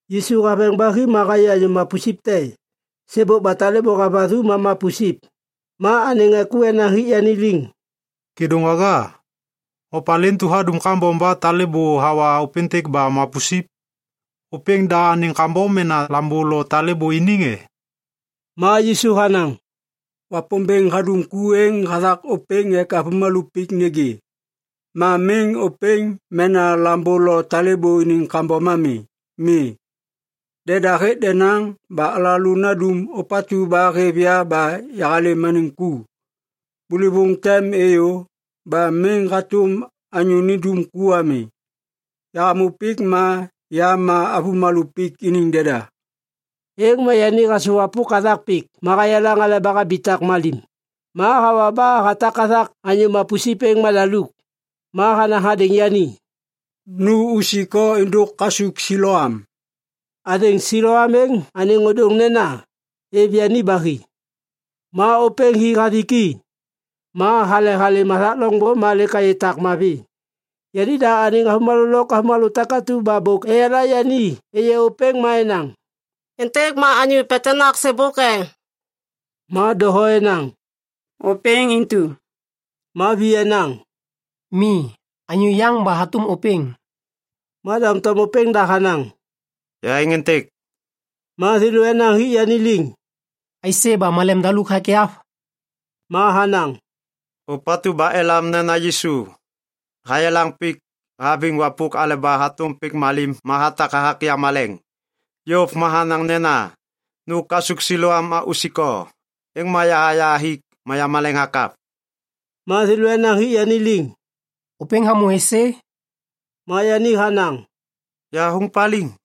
Yisu haveŋ ba hi ma hayê anyô mapusip te. Sêbôk ba talêbô havathu ma mapusip. Ma anêŋ ŋê ku enaŋ hik yani liŋ, “Kêdôŋwaga, opalê intu hadum kambom ba talêbô hawa ôpêntêk ba mapusip? Ôpêŋ da anêŋ kambom mena lambô lo talêbô iniŋ e?” Ma Yisu hanaŋ, “Wapômbêŋ hadum ku êŋ hathak ôpêŋ ek avômalô pik nêgê. Ma miŋ ôpêŋ mena lambô lo talêbô iniŋ kambom ami. Mi. Deda hêk denaŋ ba alalô nandum ôpatu ba hêv ya ba yahalêm anêŋ ku. Bôlôvôŋ tem êyô ba miŋ hatôm anyô nindum ku ami. Yahamô pik ma ya ma avômalô pik iniŋ deda.” Êŋ ma yani hasôwapôk hathak pik ma hayelaŋ aleba habitak malim. Ma hawa ba hatak hathak anyô mapusip êŋ madaluk. Ma hanaŋ hadêŋ yani, “Nu usik o êndôk kasuk Siloam.” (Athêŋ Siloam êŋ anêŋ ôdôŋ nena, “Êv yani ba hi.”) Ma ôpêŋ hi hathik i. Ma hale halêm hathak loŋbô ma lêk hayê tak mavi. Yanida anêŋ avômalô lôk avômalô takatu ba bôk eyala yani êyê ôpêŋ ma enaŋ, “Êntêk ma anyô petenak sêbôk e?” Ma doho enaŋ, “Ôpêŋ intu.” Ma vi enaŋ, “Mi, anyô yaŋ ba hatôm ôpêŋ.” Ma doŋtom ôpêŋda hanaŋ, “Ya êŋ êntêk.” Ma thêlô enaŋ hik yani liŋ, “Aisê ba malem daluk hakyav?” Ma hanaŋ, “Ôpatu ba elam nena Yisu, hayelaŋ pik haviŋ wapôk aleba hatôm pik malim ma hatak hathak yamaleŋ. Yôv ma hanaŋ nena, ‘Nu kasuk Siloam ma usik o.’ Êŋ ma yaha yahathik ma yamaleŋ hakyav.” Ma thêlô enaŋ hik yani liŋ, “Ôpêŋ hamô êsê?” Ma yani hanaŋ, “Yahathôŋ paliŋ.”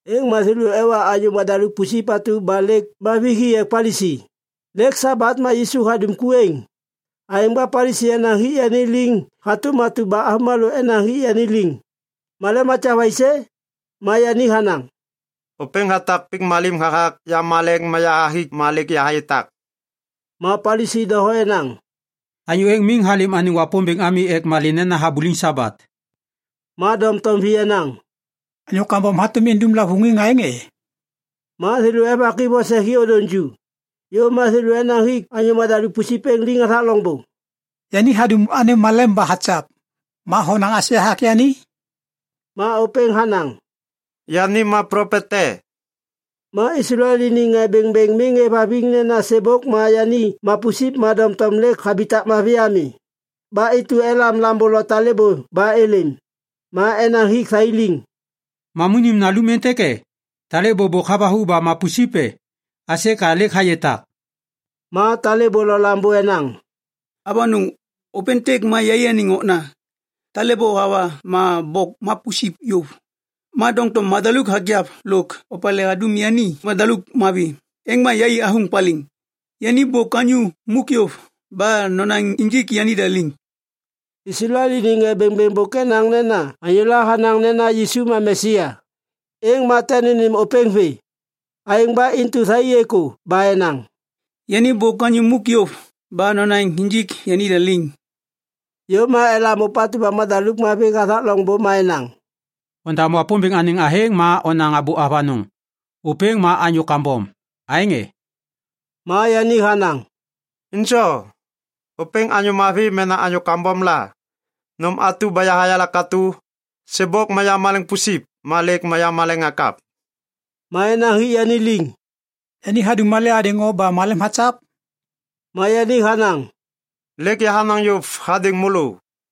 Êŋ ma thêlô ewa anyô madaluk pusip atu ba lêk mavi hi ek Palisi. Lêk Sabat ma Yisu hadum ku êŋ. Aêŋ ba Palisi enaŋ hik yani liŋ hatôm atu ba avômalô enaŋ hik yani liŋ, “Malem hakyav aisê?” Ma yani hanaŋ, “Ôpêŋ hatak pik malim hathak yamaleŋ ma yahathik ma lêk yahayê tak.” Ma Palisi doho enaŋ, “Anyô êŋ miŋ halêm anêŋ Wapômbêŋ ami ek malê nena habuliŋ Sabat.” Ma doŋtom vi enaŋ, “Anyô kambom hatôm indum lavôŋiŋ anêŋ aêŋ e?” Ma thêlô evak i vose hi ôdôŋ ju. Yôv ma thêlô enaŋ hik anyô madaluk pusip êŋ liŋ hathak loŋbô, “Yani hadum anêm malem ba hakyav. Ma honaŋ aisê hathak yani?” Ma ôpêŋ hanaŋ, “Yani ma plopet te.” Ma Islael iniŋ ŋê bêŋbêŋ miŋ êvhaviŋ nena sêbôk ma yani mapusip ma doŋtom lêk habitak mavi ami. Ba intu elam lambô lo talêbô ba êlêm. Ma enaŋ hik thai liŋ, “Mamunim nalum êntêk e? Talêbô bôk havathu ba mapusip e? Aisê ka lêk hayê tak?” Ma talêbô lo lambô enaŋ, “Avanôŋ! Ôpêntêk ma yaianiŋ okna. Talêbô hawa ma bôk mapusip yôv. Ma doŋtom madaluk hakyav lôk opalê hadum yani madaluk mavi, êŋ ma yai athôŋ paliŋ. Yani bôk anyô muk yôv ba nonaŋ injik yanida liŋ.” Islael iniŋ ŋê bêŋbêŋ bôk enaŋ nena anyôla hanaŋ nena Yisu ma Mesia, êŋ ma tem nênêm ôpêŋ vê. Aêŋ ba intu thai êkô ba enaŋ, “Yani bôk anyô muk yôv ba nonaŋ injik yanida liŋ.” Yôv ma elam ôpatu ba madaluk mavi hathak loŋbô ma enaŋ, “Ondam Wapômbêŋ anêŋ athêŋ ma onaŋ abô avanôŋ! Ôpêŋ ma anyô kambom! Aêŋ e?” Ma yani hanaŋ, “Injo! Ôpêŋ anyô mavi mena anyô kambom la! Nôm atu ba yahayala katô, sêbôk ma yamaleŋ pusip ma lêk yamaleŋ hakyav!” Ma enaŋ hik yani liŋ, “Yani hadum malê hadêŋ o ba malem hakyav?” Ma yani hanaŋ, “Lêk yahanaŋ yôv hadêŋ môlô,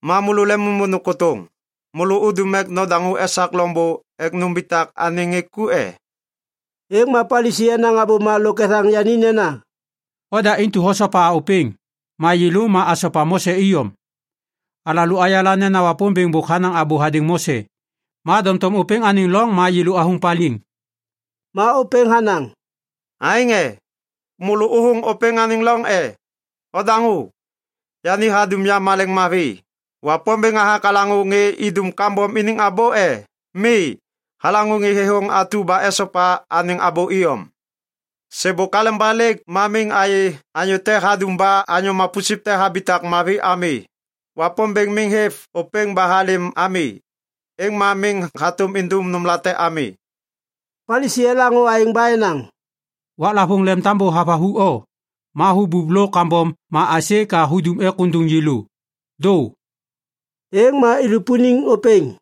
ma môlô lemimôndôŋ kôtôŋ. Môlô udum ek nodaŋô esak loŋbô ek numbitak anêŋ ŋê ku e?” Êŋ ma Palisi enaŋ abôma lôk ethaŋ yani nena, “Oda intu hosopa ôpêŋ! Ma yêlô ma asopa Mose iyom! Alalô ayala nena Wapômbêŋ bôk hanaŋ abô hadêŋ Mose. Ma doŋtom ôpêŋ anêŋ loŋ ma yêlô athôŋ paliŋ.” Ma ôpêŋ hanaŋ, “Aêŋ e? Môlô ôthôŋ ôpêŋ anêŋ loŋ, e? Odaŋô! Yani hadum yamaleŋ mavi. Wapômbêŋ hathak halaŋô ŋê idum kambom iniŋ abô e? Mi. Halaŋô ŋê thêthôŋ atu ba esopa anêŋ abô iyom. Sêbôk aleba lêk ma miŋ ayê anyô te hadum ba anyô mapusip te habitak mavi ami. Wapômbêŋ miŋ hêv ôpêŋ ba halêm ami, êŋ ma miŋ hatôm indum nômlate ami.” Palisi elaŋô aêŋ ba enaŋ, “Waklavôŋ lemtambô havathu o, ma hubup lôk kambom ma aisê ka hudum ek ôndôŋ yêlô? Dô!” Êŋ ma ilupuniŋ ôpêŋ.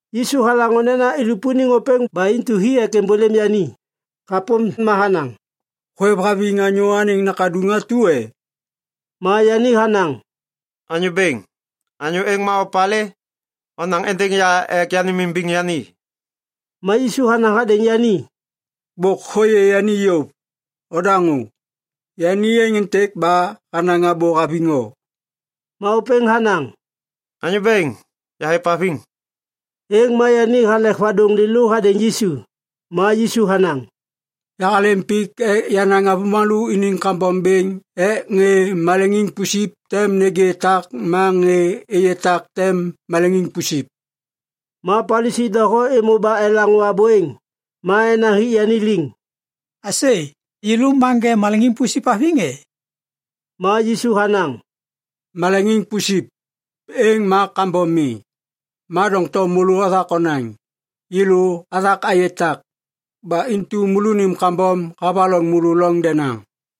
Yisu halaŋô nena ilupuniŋ ôpêŋ ba intu hi ek êmbôlêm yani. Hapôm ma hanaŋ, “Hôêvhaviŋ Anyô Anêŋ Nakaduŋ atu e?” Ma yani hanaŋ, “Anyô bêŋ, anyô êŋ ma opalê? Onaŋ êndêŋ ya ek yanêmimbiŋ yani.” Ma Yisu hanaŋ hadêŋ yani, “Bôk hôyê yani yôv. Ondaŋô! Yani êŋ êntêk ba hanaŋ abô haviŋ o.” Ma ôpêŋ hanaŋ, “Anyô Bêŋ, yahêvhaviŋ.” Êŋ ma yani halek vadôŋ lêlô hadêŋ Yisu. Ma Yisu hanaŋ, “Yahalêm pik ek yanaŋ avômalô iniŋ kambom bêŋ ek ŋê maleŋiŋ pusip tem nêgê tak ma ŋê êyê tak tem maleŋiŋ pusip.” Ma Palisi doho êmô ba elaŋô abô êŋ. Ma enaŋ hik yani liŋ, “Aisê! Yêlô ma ŋê maleŋiŋ pusip haviŋ e?” Ma Yisu hanaŋ, “Maleŋiŋ pusip, êŋ ma kambom mi. Ma doŋtom môlô othak onaŋ, ‘Yêlô athak ayê tak.’ Ba intu môlônim kambom havaloŋ môlô loŋ denaŋ.”